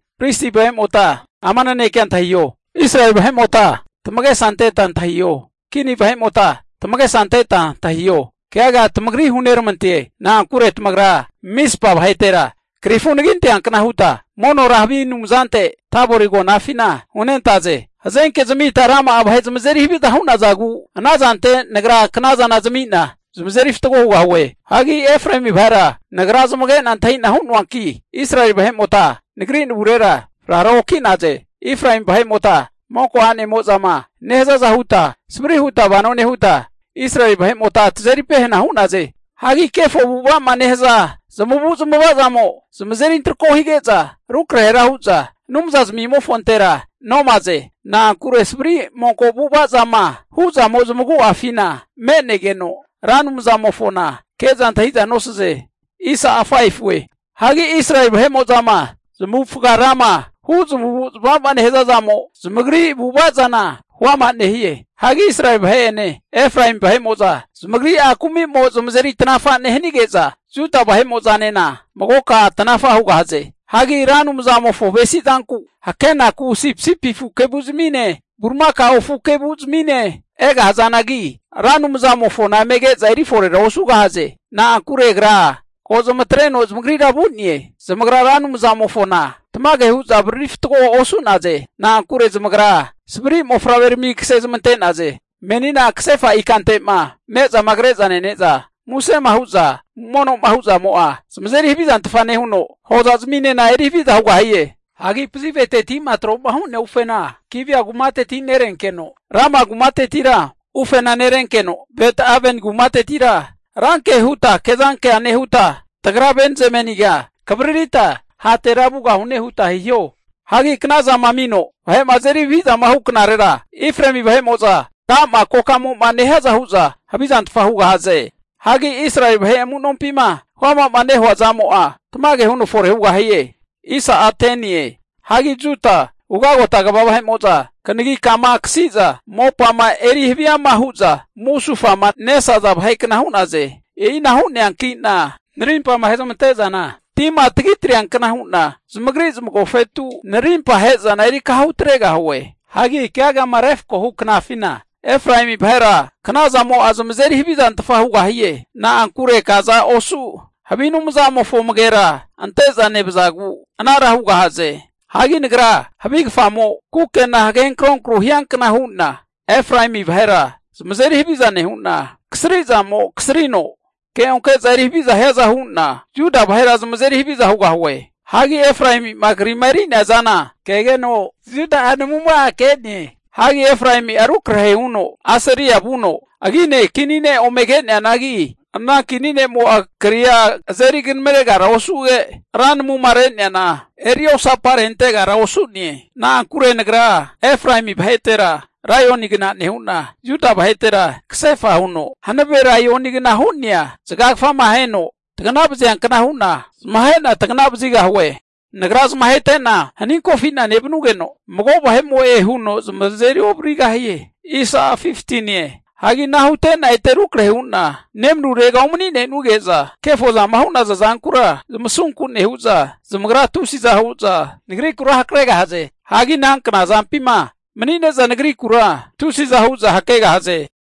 Pristi vahe'mota ama nanekea antahiho! Israeli vahe'mota tamagesa anteta antahiho! Kini vahe'mota tamagesa anteta antahiho! Keaga tamagri huneramante. Na'ankure tamagra Mizpa vahetera krifu anagi anteankna huta monora havi anumzante Tabori agonafina hunentaze. Hazenke zamita rama'a vahe zamazeri haviza hu'nazagu ana zantera Nagra kna zana tami'na tamazeri fatgo hugahue. Hagi Efraemi vahera Nagra zamage'na antahi'na hu'noanki, Israeli vahe'mota Nagri navurera frara oki'naze. Efraemi vahe'mota monko anemo'zama nehazaza huta savri huta vano nehuta, Israeli vahe'mota tamazeri pehana hu'naze. Hagi kefo avu'ava'ma nehaza zamavu'zmava'zamo zamazeri antrako hige'za rukrahera hu'za Anumza zmimofontera nomaze. Na'ankure savri monko avu'avazama hu'zamo zamagu'afina me'negeno, Ra Anumzamofona ke'za antahi'za nosaze. Hagi Israeli vahe'mo'zama zamavufaga rama hu' zamavu'zamava nehaza zamo, zamagri avu'ava zana huama nehie. Hagi Israeli vahe'ene, Efraemi vahe'mo'za zamagri'a kumimo zamazeri tanafa nehanige'za, Juda vahe'mo'zanena magoka tanafa hugahaze. Hagi Ra Anumzamofo avesizanku hakenaku sipisipi afu kevu'zamine, bulimakao afu kevu'zmine egahazanagi, Ra Anumzamofona eme ke'za eriforera osugahaze. Na'ankure Agra ko zamatreno zamagrira vu'ne. Zamagra Ra Anumzamofona tamage hu'za avariri fatgoa osu'naze. Na'ankure zamagra savri mofavrerami kasezmante'naze. Menina kasefa ikante'ma ne'zama kreza nene'za musema hu'za mono'ma hu'zamo'a zamazeri havizantfa nehuno, hozazminena eri haviza hugahie. Hagi pazivete'ma tro'ma hu'nea ufena Gibea kumateti nerenkeno, Rama kumatetira ufena nerenkeno, Bet-Aveni kumatetira ranke huta kezankea nehuta, tagra Benzameniga kavaririta hatera vugahune huta hiho. Hagi knazama amino vahe'ma azeri havizama hu knarera, Efraemi vahe'mo'za ka'ma kokamo'ma nehiaza hu'za havizantfa hugahaze. Hagi Israeli vahe amunompima huama'ma nehua zamo'a tamage huno fore hugahie. Hagi Juda ugagota kva vahe'mo'za kanagi kama akasi'za mopama eri haviama huza musufama nesaza vahe kna hu'naze. E'ina hu'neankina narimpama ahe'zamante'zana tima tagitreankna hu'na zamagri zamagofetu narimpa ahe'zana erikaha hutregahue. Hagi keagama refkohu knafina Efraemi vahera knazamo'a zamazeri havizantfa hugahie. Na'ankure kaza osu havi anumzamofo amagera ante'za nevazagu anara hugahaze. Hagi Nagra havi (moth) kfamo kukena hagenkro kru hiankna hu'na Efraemi vahera zamazeri haviza nehu'na, kasri zamo kasrino keonke'za eri haviza hiaza hu'na Juda vahera zamazeri haviza hugahue. Hagi Efraemi'a agrama krima eri'nea zana kegeno, Juda'a namuma'a ke'ne. Hagi Efraemi'a rukrahe huno Asiria vuno agine kini ne' ome ke'neanagi, ana kini ne'mo'a kri'a azeri kanamaregara osuge, ra namuma re'neana eri osaparentegara osu'ne. Na'ankure Nagra Efraemi vahetera laionigna nehu'na, Juda vahetera kasefa huno hanave laionigna hu'nena zagagafama aheno tagana vaziankna hu'na zamahe'na tagana vazigahue. Nagra zamahete'na haninkofi'na nevanugeno, mago vahe'mo'e huno zamazeri ovarigahie. Hagi ana hute'na ete rukrahe hu'na nemanurega umani'nenuge'za, kefozama hu'naza zankura zamasunku nehu'za, zamagra tusiza hu'za Nagrikura hakregahaze. Hagi ana knazampima mani'neza nagrikura tusiza hu'za hakegahaze.